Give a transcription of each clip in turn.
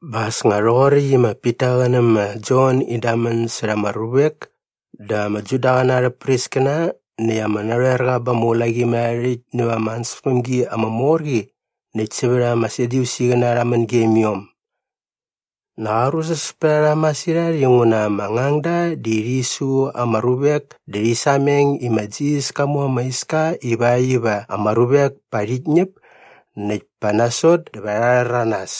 Bä as nga rhoqoräkt i ma Pita qä nä ma Jon in damän särha ama ruvek dä ama Judaqäna arhä priskäna näkt ama narhoerqa ba ama ulaqimärharhärhäkt näva ama ansäspämgi ama mor qi näkt sävät ama Sadyusiqäna rha män gem iom. Nak arusus pät a rha masirhat inguna ama ngangda di rhi su ama ruvek dä rhi sameng i ma Jisas ka mu ama iska ivakt iva ama ruvek pa rhit ñäp näkt pa nasot dä va rha rhäranas.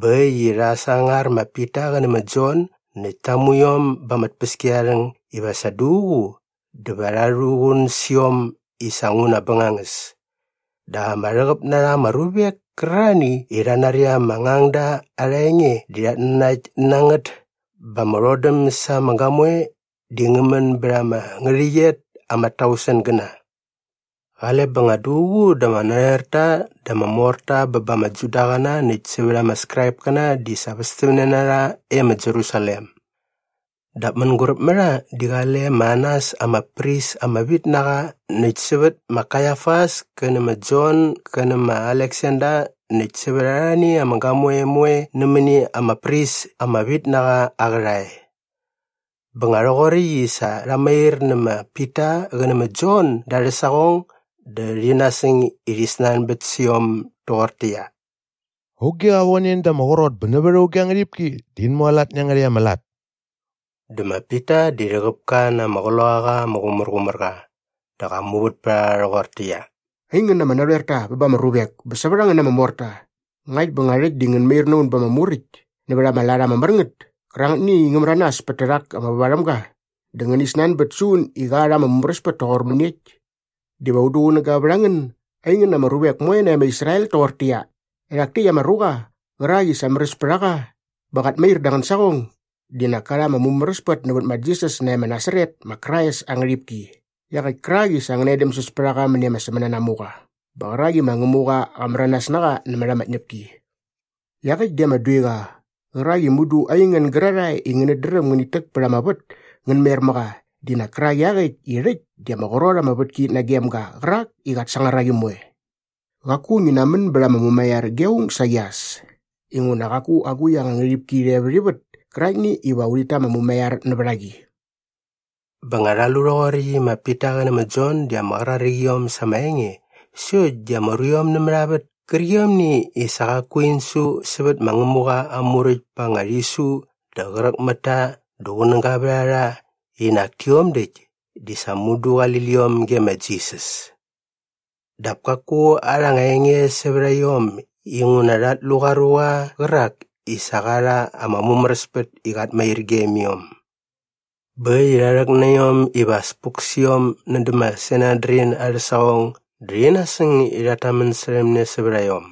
Bä äkt i rha sangar ma Pita qä nä ma Jon näkt ta mu iom ba ama tpäskiarharhäng iva sa duququ dä va rha rhuqun sä iom i sa nguna bängangäs. Dap ama rhäqäp na rha ama ruvek kärarhani i rha nari ama ngangda arha enge di rhat nanakt na ngät bä ama rhodäm sa ama gamoe di ngä män bät ama ngärhäqyet ama tausengäna. Qale bä nga duququ dä ama narhoerta dä ama morta bä ba ama Judaqäna näkt sävät ama Skraipkäna di sa västämne na rha e ma Jerusalem. Dap mänguräp mä rha di qale ma Anas ama pris ama vit na qa näkt sävät ma Kaiafas kä nä ma Jon gä nä ma Aleksander näkt sävät arhani ama gamoe moe nämäni ama pris ama vit na qa aa qärhae. Bä nga rhoqoräkt i sa rha mair nä ma Pita qä nä ma Jon da arhä saqong dä rhi nasäng i rhi snanbät sä iom doqortäqyia, “Auge qa von en da ama qrot bä nävät auge aa ngärhipki dä in mualat nä iangärhäkt ama lat?” Dä ma Pita di rhäqäp ka na ama Qloqaqa ama Qumärqumärqa dä qa muvät pät a rha rhoqortäqyia, “Aingän ama narhoerta ba ama ruvek bä sävät a ngän ama morta, ngakt bä nga rhäkt di ngän mair na un ba ama muräkt nävät ama lat ama mär ngät kärangätni i ngä märanas pät tärhak ama vävarhämga dä ngäni snanbät sä un i qa rha ama mumäräspät toqor mäniekt diva un duqunäga vät a ngän aingän ama ruvek moe nae ma Israel toqortäqyia, erhak täkt ama ruqa qärak i sa märäs pät a qa bä qat mair da angän saqong di nak ka rha ama mumäräspät nävät ma Jisas nae ma Nasaret ma Krais aa ngärhipki iaqäkt kärak i sa ngäna edämsäs pät a qa mäni ama sämänanamuqa bä qärak i ma Ngämuqa qa märanas na qa nämät ama tñäpki. Iaqäkt di ama duiqa qärak i mudu aingän gärarhae i ngänät dräm ngänit täk pät ama vät ngän mer mä qa di nak kärak iaqäkt i rhäkt di ama qrot ama vätki nagem ga qärak i qat sangar a qi moe. Qaku ngi namän bät ama mumaiar ge aung saqi as inguna qaku agukt anga ngärhipki rhe vät ivät käraktni iva urhit ta ama mumaiar nävät a qi.” Bä nga rha lu rhoqoräkt i ma Pita qä nä ma Jon di ama qraräk iom sa ama enge sokt di ama ruiom nämät a vät kärqiomni i sa qaku in su sävät ma Ngämuqa aa Muräkt pa anga rhisu dä qräk mät ta dä qunäga vät a rha i nak tiom däkt di sa mudu di qali liom ge ma Jisas. Dap kaku arha anga enge sävät a iom inguna rhat lu qa ruqa qärak i sa qa rha ama mumäräspät i qat mair e gem iom. Bä äkt i rha rhäk na iom iva as puk sä iom nädä ma Sanedrin arhä saqong dä rhi nasäng i rhat tamän särhäm ne sävät a iom.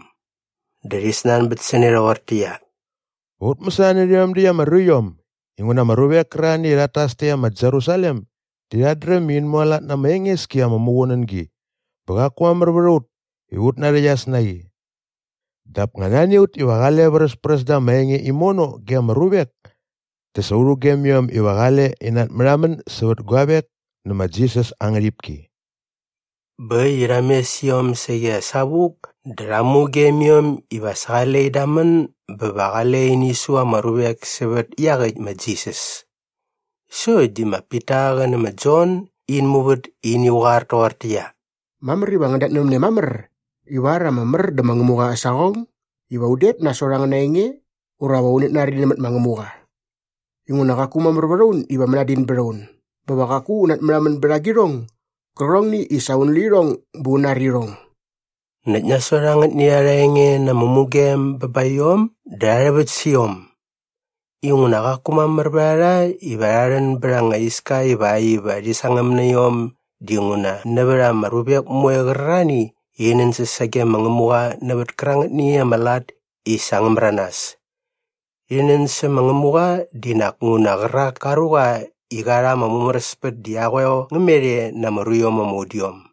Dä rhi snanbät sä ne rhoqortäqyia, “Va ut mäsana nä rhiom däkt ama ruiom inguna ama ruvek kärarhani i rhat tas e ma Jerusalem di rhat dräm i in mualat na ama enges ki ama muqunängi bä qaku mamär vät a ut iva ut narhäqyas na qi? Dap nga nani a ut iva qale vräspräs da ama enge imono ge ama ruvek dä sa u rhugem iom iva qale in natmärhamän sävät guavek nä ma Jisas aa ngärhipki.” Bä äkt i rha mes iom saqi as savuk dä rha mugem iom iva sa qale in damän bä va qale ini su ama ruvek sävät iaqäkt ma Jisas. Sokt di ma Pita qä nä ma Jon in muvät i ini qoar toqortäqyia, “Mamär iva ngän datnävämne mamär ivar ama mär dä ma Ngämuqa aa saqong iva un det nasot angäna enge ura va unät nari nämät ma Ngämuqa. Inguna qaku mamär vät a un iva mänadin däm un bä va qaku un natmärhamän bät agirhong gärqärhongni i sa un lu irhong bä un nari irhong.” Näkt nasot angätni arha enge na ama mugem bä ba iom dä rha rhäväkt sä iom. Inguna qaku mamär vät a rha iva rha rhän bät anga iska ivakt iva rhi sangäm na iom dinguna nävät ama ruvek moe qärarhani i rhi nänsäs sage ma Ngämuqa nävät kärangätni ama lat i sa ngä märanas. Rhi nän sä ma Ngämuqa di nak nguna qärak ka ruqa i qa rha ama mumäräspät di aa qoeo ngä met e na ama ruiom ama udiom.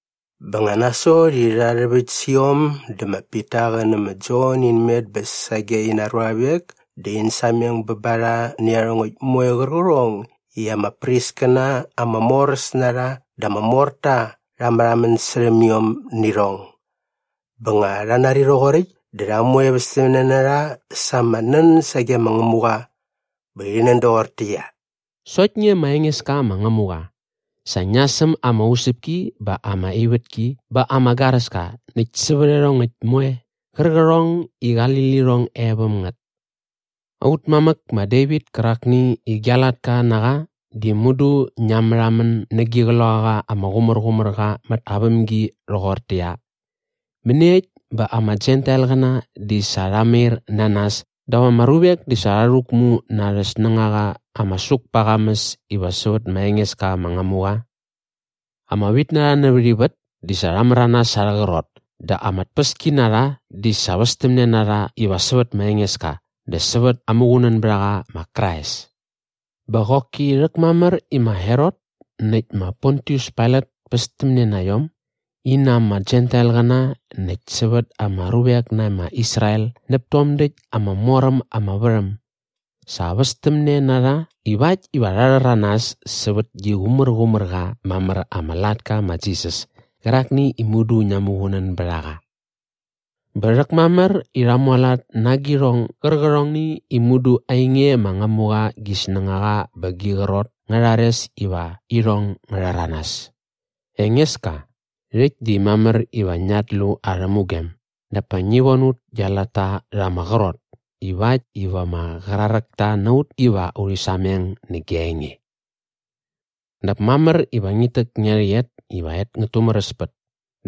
Bä nga nasot i rha rhäväkt sä iom dä ma Pita qä nä ma Jon in met bä sage ina ruavek dä in sameng bä ba rha nä iarhongäkt moe qärqärhong i ama priskäna ama moräs na rha dä ama morta rha märhamän särhäm iom nä irhong. Bä nga rha nari rhoqoräkt dä rha moe västämne na rha sa ama nän sage ma Ngämuqa. Bä rhi nän doqortäqyia, “Sokt nge ma Engeska ma Ngämuqa, sa ngia säm ama usäpki bä ama ivätki bä ama garäska näkt sävät iarhongäkt moe qärqärhong i qali lirhong e väm ngät. Aut mamäk ma Devit kärakni i gia latka na qa di mudu ngia märhamän nä gi Qloqaqa ama Qumärqumärqa mät aa vämgi rhoqortäqyia, “‘Mäniekt bä ama Jentailqäna di sa rha mair na nas dap ama ruvek di sa rha rhäkmu na arhä snängaqa ama suk pa aa qamäs iva sävät ma Engeska ma Ngämuqa? Ama vitnarha nävät ivät di sa rha märanas sa arhä qrot dä ama tpäskinarha di sa västämne na rha iva sävät ma Engeska dä sävät aa Muqunänbärhaqa ma Krais.’ Bä qoki rhäkmamär i ma Herot näkt ma Pontius Pailat pästämne na iom in na ama Jentailqäna näkt sävät ama ruvek nae ma Israel näp tom däkt ama mor äm ama värhäm. Sa västämne na rha ivakt iva rha rhäranas sävät gi qumärqumär qa mamär ama latka ma Jisas kärakni i mudu ngia muqunän bät a qa. Bä rhäkmamär i rha mualat na agirhong gärqärhongni i mudu ainge ma Ngämuqa gi snängaqa bä gi qrot ngä rhares iva irhong ngä rhäranas. “Engeska, rhäkt di mamär iva ngiat lu arhä mugem dap pa ngi von ut gia latta rha ama qrot ivakt iva ama qraräkta na ut iva urhi sameng nä gia enge. Dap mamär iva ngit täk ngia rhäqyet iva et ngät tumäräspät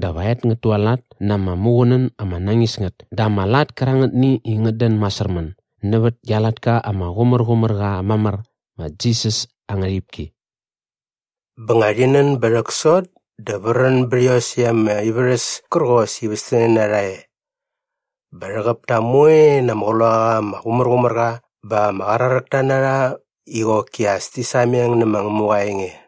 dä va et ngät tualat na ama muqunän ama nañis ngät dä ama lat kärangätni i ngät dän masärmän nävät gia latka ama qumärqumär qa mamär ma Jisas aa ngärhipki.” Bä nga rhi nän bä rhäksot dä vrän bät iosäkt ama ivärhäs kärqos i västämne na rha e. Bä rhäqäp ta moe na ama Qloqaqa ama Qumärqumärqa bä ama qraräkta na rha i qoki as ti sameng nä ma Ngämuqa aa enge.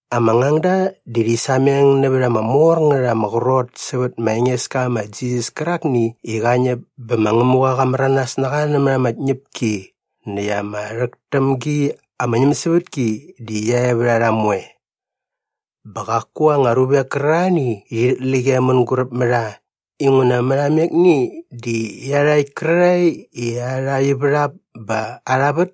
Ama ngangda di rhi sameng nävät ama mor ngät ama qrot sävät ma Engeska ma Jisas kärakni i qa ñäp bä ma Ngämuqa qa märanas na qa nämät ama tñäpki näkt ama rhäk täm gi ama ñämsävätki di qia e vät a rha moe. Bä qaku anga ruvek kärarhani i rhit läk e mänguräp mä rha inguna mät amekni di iarhakt kärarhae i arha ivärhap bä arha vät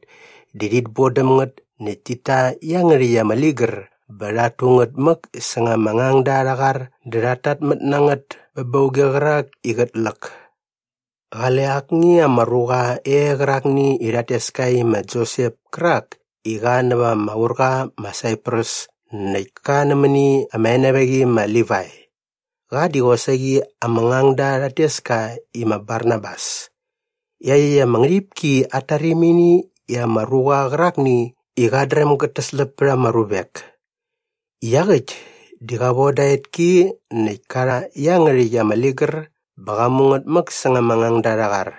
di rhit bodäm ngät näkt tit ta iangärhäkt ama ligär bä rhat tu ngät mäk säng ama ngangda arha qar dä rhat tatmät na ngät bä ba auge qärak i qät läk. Qale akni ama ruqa e qärakni i rhat tes ka i ma Josep kärak i qa näva ama urqa ma Saiprus näkt ka nämäni ama enevaqi i ma Livai. Qa di qosaqi ama ngangda rhat tes ka i ma Barnabas. Iaqyäkt ama ngärhipki at tarimini i ama ruqa qärakni i qat dräm gät täsläp pät ama ruvek. Iaqäkt di qa voda aa etki näkt ka rha iangärhäkt ama ligär bä qa mu ngät mäk säng ama ngangda arha qar.